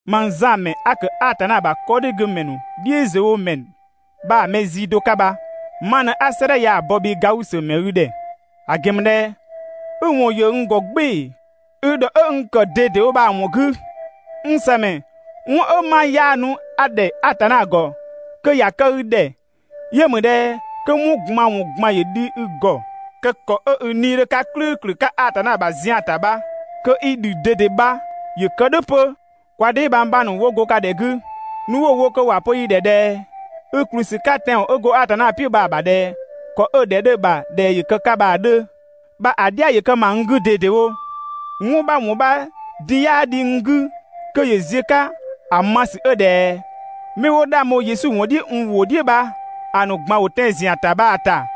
Mang Zan ‑mɛ 'a ‑kë Atanna ‑bha 'kɔdhigümɛ ‑nu "dhiʋ̈ziöwomɛ bha‑ mɛ zii do 'ka bha ma ꞊në 'a 'sëëdhɛ ya‑ bɔ bhii Gausö ‑mɛ i ‑dhɛ; ‑a ‑gɛn ‑mü ꞊dhɛ i ‑wɔn ‑yö n ‑gɔ "gbɩɩ‑ i ‑dhɔ 'ö n ‑kë ꞊dedewo bha‑ ‑wɔn 'gü. N ‑sëmɛ, 'wɔn 'ö 'ma 'yaanu 'a‑ ‑dhɛ Atanna ‑gɔ kö ‑ya kë i ‑dhɛ yö ‑mü ꞊dhɛ kö 'wɔn ꞊gban ‑wɔn ꞊gban ‑yö dhi i ‑gɔ, kö ‑kɔ 'ö i 'nii‑ 'dhö 'ka "klʋ̈ʋ̈klʋ̈ 'ka Atanna ‑bha zian ‑ta bha, kö i ‑dhü ꞊dede ‑bha ‑yö kë "dhʋ̈ 'pö. Kwa dheebhang 'bha ‑nu 'wo go ka ‑dhɛ 'gü, nu 'wo‑ wo kö ‑wa pö yi ‑dhɛ ꞊dhɛ i ‑kplü ‑sü 'ka tɛanwɔn 'ö go Atanna "piʋ̈ bha‑ ‑bha ꞊dhɛ ‑kɔ 'ö‑ ‑dhɛ 'dhö‑ ‑bha ꞊dhɛ ‑yö kë‑ 'ka‑ 'dhö bha‑ "dhia ‑yö kë ‑ma n 'gü ꞊dedewo. 'Wɔn 'bha ‑wɔn 'bha din 'yaa dhi n 'gü kö ‑yö ziö‑ 'ka ‑a ma ‑sü 'ö ꞊dhɛ mɛ 'wo 'dhang bho Yesu ‑wɔn "dhiʋ̈ n ‑wʋ "dhiʋ̈ bha‑ ‑nu ꞊gban ‑wo tɛan‑ ‑zian ‑ta bha‑ ‑ta.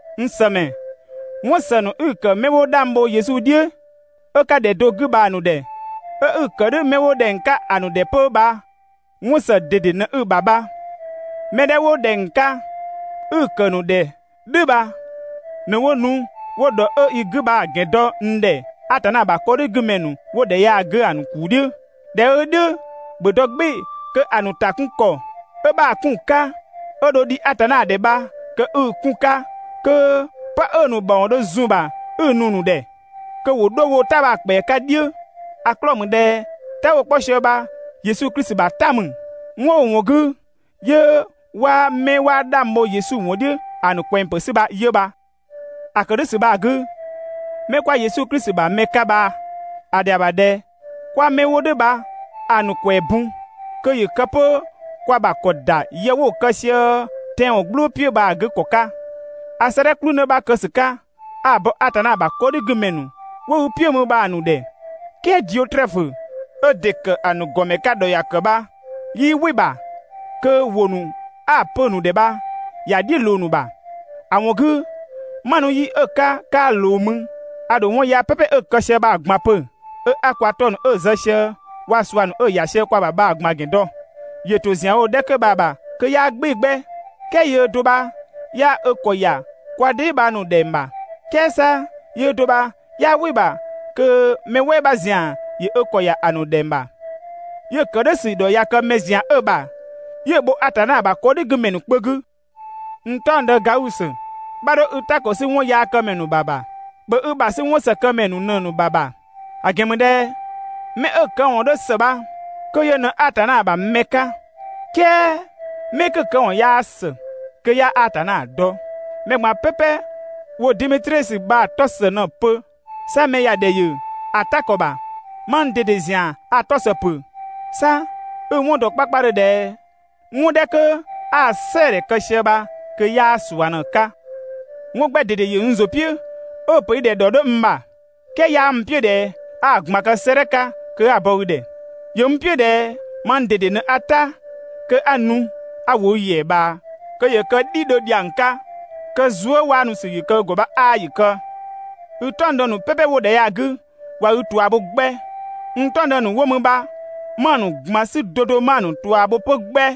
N ‑sëmɛ, 'wɔn ‑së ‑nu 'i‑ ‑kë 'mɛ 'wo 'dhang bho Yesu "dhiʋ̈ 'ö 'ka ‑dhɛ do 'gü bha‑ ‑nu ‑dhɛ, 'ö 'i‑ kë "dhʋ̈ 'mɛ 'wo ‑dhɛng 'ka ‑a ‑nu ‑dhɛ 'pö bha 'wɔn ‑së ꞊dede ꞊në 'i‑ ‑bha bha. Mɛ 'dhɛ 'wo ‑dhɛng 'ka 'i‑ ‑kë ‑nu ‑dhɛ "dhʋ̈ bha ꞊në 'wo nu 'wo ‑dhɔ 'ö i 'gü bha‑ ‑gɛn dɔ n ‑dhɛ Atanna ‑bha 'kɔdhigümɛ ‑nu 'wo ‑dhɛ ya‑ 'gü‑ ‑nu ‑kuu "dhiʋ̈. ꞊Dhɛ 'ö "dhʋ̈, ‑bhö dɔ "gbɩɩ‑ kö‑ ‑nu ‑ta 'kun ‑kɔ 'ö 'bha‑ 'kun‑ 'ka 'ö dho dhi Atanna ‑dhɛ bha kö 'i‑ 'kun‑ 'ka kö ('pë 'ö‑ ‑nu ‑mawɔn dho zun‑ ‑bha 'i‑ nu‑ ‑nu ‑dhɛ) kö ‑wo 'dho woo‑ "ta bha‑ ‑kpɛa 'ka "dhiʋ̈. ‑A 'klɔɔ‑ ‑mü ꞊dhɛ "ta 'wo‑ 'kpɔ sië bha Yesu Klisi ‑bha "ta ‑mü. 'Wɔn 'ö‑ ‑wɔn 'gü 'yö 'waa 'mɛ 'waa 'dhang bho Yesu ‑wɔn "dhiʋ̈ ‑a ‑nu ꞊kwɛng ‑pë 'sü bha 'yö bha. ‑A ‑kë "dhʋ̈ ‑sü bha‑ 'gü, 'mɛ 'kwa Yesu Klisi ‑bha mɛ 'ka bha‑ ‑dhɛa ‑bha ꞊dhɛ 'kwa 'mɛ 'wo "dhʋ̈ bha‑ ‑nu ‑kwɛɛ bun, kö ‑yö kë 'pö kwa ‑bha ‑kɔ ‑da yë 'wo‑ kë sië tɛanwɔn "gblʋʋ "piʋ̈ bha‑ 'gü ‑kɔ 'ka. A 'sëëdhɛ "kplü 'në 'bha kë ‑sü 'ka 'a‑ bɔ Atanna ‑bha 'kɔdhigümɛ ‑nu wo i "piʋ̈ mü bha‑ ‑nu ‑dhɛ, "kɛɛ Diotrɛfö 'ö ‑dɩ ‑kë ‑a ‑nu ‑gɔmɛ 'ka ‑dhɔ ‑ya ‑kë bha 'yii "wɩ‑ ‑bha kö ‑wʋ 'a‑ pö‑ ‑nu ‑dhɛ bha ‑ya "dhiʋ̈ ꞊loo‑ ‑nu ‑bha. ‑A ‑wɔn 'gü, 'ma nu yi 'ö‑ 'ka 'kaa ꞊loo mü, a ‑dho 'wɔn yaa "pɛpɛ 'ö‑ kë sië bha‑ ꞊gban pö, 'ö 'a kwa 'tɔ ‑nu 'ö‑ zë sië waa‑ ꞊sua ‑nu 'ö‑ ‑ya sië kwa ‑bha bha‑ ꞊gban ‑gɛn dɔ. ‑Yö ‑to ‑zian wo‑ 'dhɛ 'kö bha‑ ‑bha kö 'yaa "gbɩɩ‑ 'gbɛ, "kɛɛ yöö do bha 'yaa ö ‑kɔ ‑ya kwa dheebhang ‑nu ‑dhɛng ‑bha, "kɛɛ 'sa yöö do bha 'yaa "wɩ‑ ‑bha kö mɛ "wɛɛ 'bha ‑zian ‑yö ö ‑kɔ ‑ya ‑a ‑nu ‑dhɛng ‑bha, 'yö‑ ‑kë "dhʋ̈ ‑sü ‑dhɔ ꞊ya kë 'mɛ ‑zian 'ö‑ ‑bha 'yö‑ bho Atanna ‑bha 'kɔdhigümɛ ‑nu kpö 'gü. N "taɔngdë Gausö, 'bha 'dho i "ta ‑kɔ 'sü 'wɔnyaakëmɛ ‑nu ‑bha ‑bha. ‑Bhö i ‑bha 'sü 'wɔnsëkëmɛ ‑nu ꞊në‑ ‑nu ‑bha ‑bha; ‑a ‑gɛn ‑mü ꞊dhɛ 'mɛ 'ö‑ këwɔn 'dhö ‑së bha kö yö ꞊në Atanna ‑bha mɛ 'ka, "kɛɛ 'mɛ 'kö‑ këwɔn 'yaa ‑së, kö 'yaa Atanna dɔ. Mɛ ꞊gban "pɛpɛ ‑wo Demetrisö bha‑ 'tɔ ‑së ꞊në‑ pö. 'Sa mɛ ‑ya ‑dhɛ ‑yö ‑a "ta ‑kɔ ‑bha. Mang ꞊dede ‑zian a‑ 'tɔ ‑së ‑pö. 'Sa i‑ 'wɔn dɔ 'kpakpadhö ꞊dhɛ 'wɔn 'dhɛ 'kö 'a‑ "sɛɛdhɛ kë sië bha kö 'yaa ꞊sua ꞊në‑ 'ka. 'Wɔn 'gbɛ ꞊dede ‑yö n ‑zʋ "piʋ̈ 'ö‑ ‑pö i ‑dhɛ ‑dhɔ 'dhö n ‑bha. "Kɛɛ 'yaa n "piʋ̈ ꞊dhɛ 'a‑ ꞊gban kë 'sëëdhɛ 'ka kö 'a‑ bɔ i ‑dhɛ. ‑Yö n "piʋ̈ ꞊dhɛ mang ꞊dede ꞊në 'a "ta kö 'a nu 'a ‑wo i ‑yɛa ꞊bhaa kö ‑yö kë "dhidhö ‑dhiang 'ka. Kö zuëwaanusü ‑yö kë i ‑gɔ bha 'aa ‑yö kë! I "taɔngdë ‑nu "pɛpɛ 'wo ‑dhɛ ya‑ 'gü ꞊wa i ꞊tua bho 'gbɛ. N "taɔngdë ‑nu 'wo mü bha 'ma‑ ‑nu ꞊gban 'sü 'do 'do 'ma‑ ‑nu ꞊tua bho 'pö 'gbɛ!